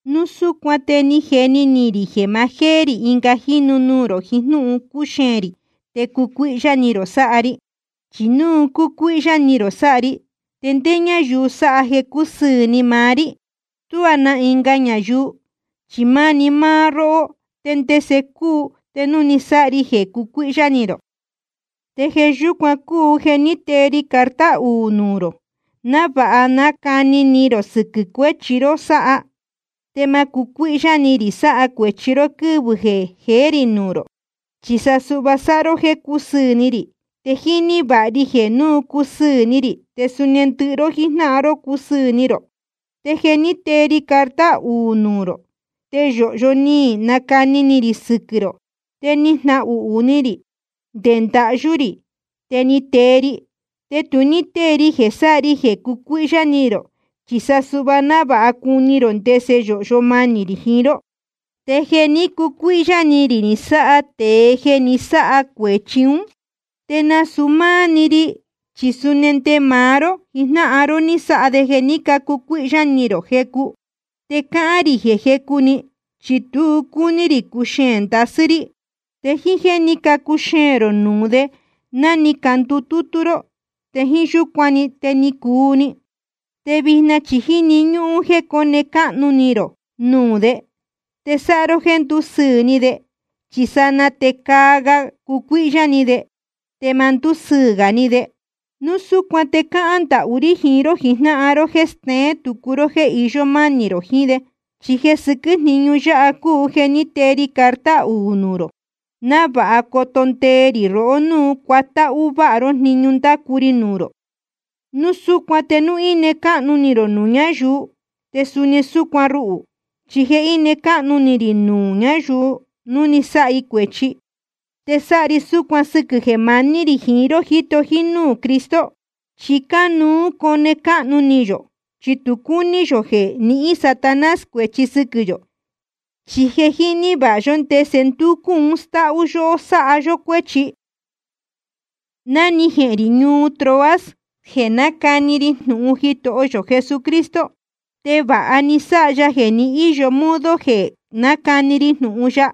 Núu súcuan te ni jeni ni rī jeē ma jéé rī ɨnga jínu nuū rō jiín jnúhun cuxeēn rī te cucuíhyá ni rō sáha ri. Chi núu cucuíhyá ni rō sáha ri, ¿te ndé ñáyuu sáha jeē cusɨɨ̄ ni maá rí? Tuá na ɨnga ñayuu, chi máni máá róhó, te ndese cuu te núu ni sáha ri jeē cucuíhyá ni rō. Te jeē yúcuan cúu jeē ní tee ri carta un núū rō, návāha nacani ni rō sɨquɨ̄ cuéchi ró sáha, te ma cucuíhyá ni rī sáha cuēchi ró quɨ́vɨ̄ jeé rī nuū rō. Chi sa suhva sáha ró jéē cúsɨɨ̄ ni rī. Te jíní vāha ri jeē núu cusɨɨ̄ ni rī, te suni ndɨhɨ ró jíjnáhan ró cusɨɨ̄ ni rō. Te jeē ní tee ri carta un núū rō, te yōhyo ni nacani ni rī sɨquɨ̄ rō, te ni jnahuhū ni rī, te nde ndahyú rī ni tee ri. Te tu ní tée ri jeē sáha ri jeē cucuíhyá ni rō, chi sa suhva návāha cuni rō ndese yōhyo manī rī jiín ró. Te jeē ní cucuíhyá ni rī ni sáha tēe jeē ni sáha cuēchi ún, te nasūu máá‑ni ri, chi suni nde máá ró jijnáhan ró ni sáha de jeē ní cacucuíhyá ni rō jecu. Te cáhán rī jeē jecu‑ni, chi tu cúní rī cuxeēn ndasɨ́ rí. Te jíín jéē ní cacuxeēn rō nuū de ná ni candutútú ró, te jíín yúcuan‑ni te ni cuu‑ni. Te vijna chi jíni ñúhún jeē cóne cáhnu ni rō nuū de, te sáha ró jéē ndúsɨɨ̄ ni de, chi sanaa te caa ga cucuíhyá ni de, te ma ndúsɨɨ̄ gā ni de. Núu súcuan te cáhán ndahú rí jiín ró jijnáhan ró jéē steén tucu ró jéē iyó mánī rō jiín de. Chi jeē sɨquɨ́ jniñu yáha cúu jeē ní tee ri carta un núū rō, návāha coto ndee rī rohó núu cuatáhú váha ró jniñu ndácu ri nuū rō. Núu súcuan te núu íne cáhnu ni rō nuū ñayuu, te suni súcuan ruhū. Chi jeē íne cáhnu ni rī nuū ñayuu núu ni sáha i cuēchi, te sáha ri súcuan sɨquɨ̄ jeē maní rī jiín ró jíto jínúū Cristo. Chi cánuú cone cáhnu ni yō, chi tu cúní yō jeē nihín Satanás cuēchi sɨquɨ̄ yō, chi je jíní vāha yó ndese ndúcú un stáhú yóhó sáha yó cuéchi. Ná ni jehēn rī ñuu Troas jeē nácani ri jnūhun Jitoho yō Cristo, te vāha ni sáha ya jeē ni íyo modo jeē nácani ri jnūhun ya.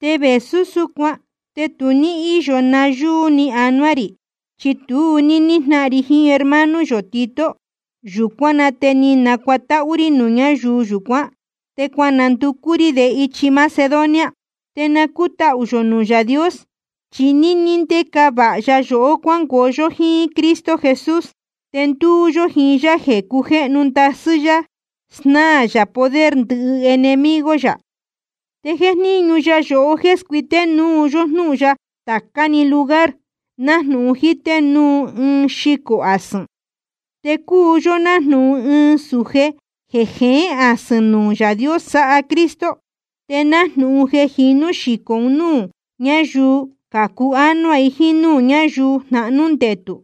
Te vēsú súcuan te tu ní íyo nayúú ni anuá rī, chi tu ní níjnáhan ri jiín hermano yō Tito. Yūcuán na te ni nacuatáhú rí nuū ñáyuu yūcuán, te cuananducú rí de ichi Macedonia. Te na cútahū yō nuū Yaā Dios, chi níní ndéca vāha ya yohó cuángoo yó jíín Cristo Jesús, te ndúú yó jiín yá jeē cujéhnu ndasɨ́ yá snáā yā poder ndɨhɨ enemigo yā. Te jéjníñu ya yohó jéē scuité núu yó jnúhun ya tācá‑ni lugar, nájnūhun jíté núu ɨɨn xicō asɨ̄n. Te cúu yó nájnūhun ɨɨn sūje jeē jeén asɨ̄n nuū Yaā Dios sáha Cristo. Te nájnūhun jeē jinú xicō un núū ñáyuu cācu ánuá jiín núū ñáyuu jnahnū ndetū.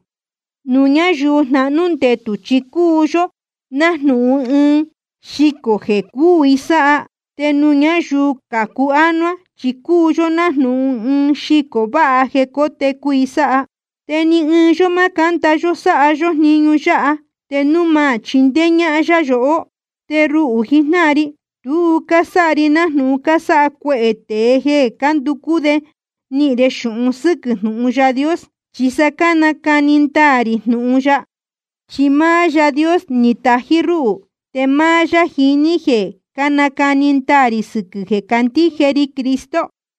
Nuū ñáyuu jnahnū ndetū chi cúu yó nájnūhun ɨɨn xicō jeē cúū i sáha, te nuū ñáyuu cācu ánuá chi cúu yó nájnūhun ɨɨn xicō váha jeē cótecu i sáha. Te ni ɨɨn yó ma cánda yó sáha yó jniñu yáha, te núu ma chindéé ñáhán yá yohó. Te ruhū jijnáhan ri, tu cásáha ri nájnūhun cásáha cuehē tēe jeē cánducú de nihīn de xūhun sɨ́quɨ̄ jnūhun Yaā Dios. Chi sa cánacani ndaā rī jnūhun ya, chi máá Yaā Dios ni tají rúhū, te máá yá jiní jeē cánacani ndaā rī sɨquɨ̄ jeē cácandíje ri Cristo.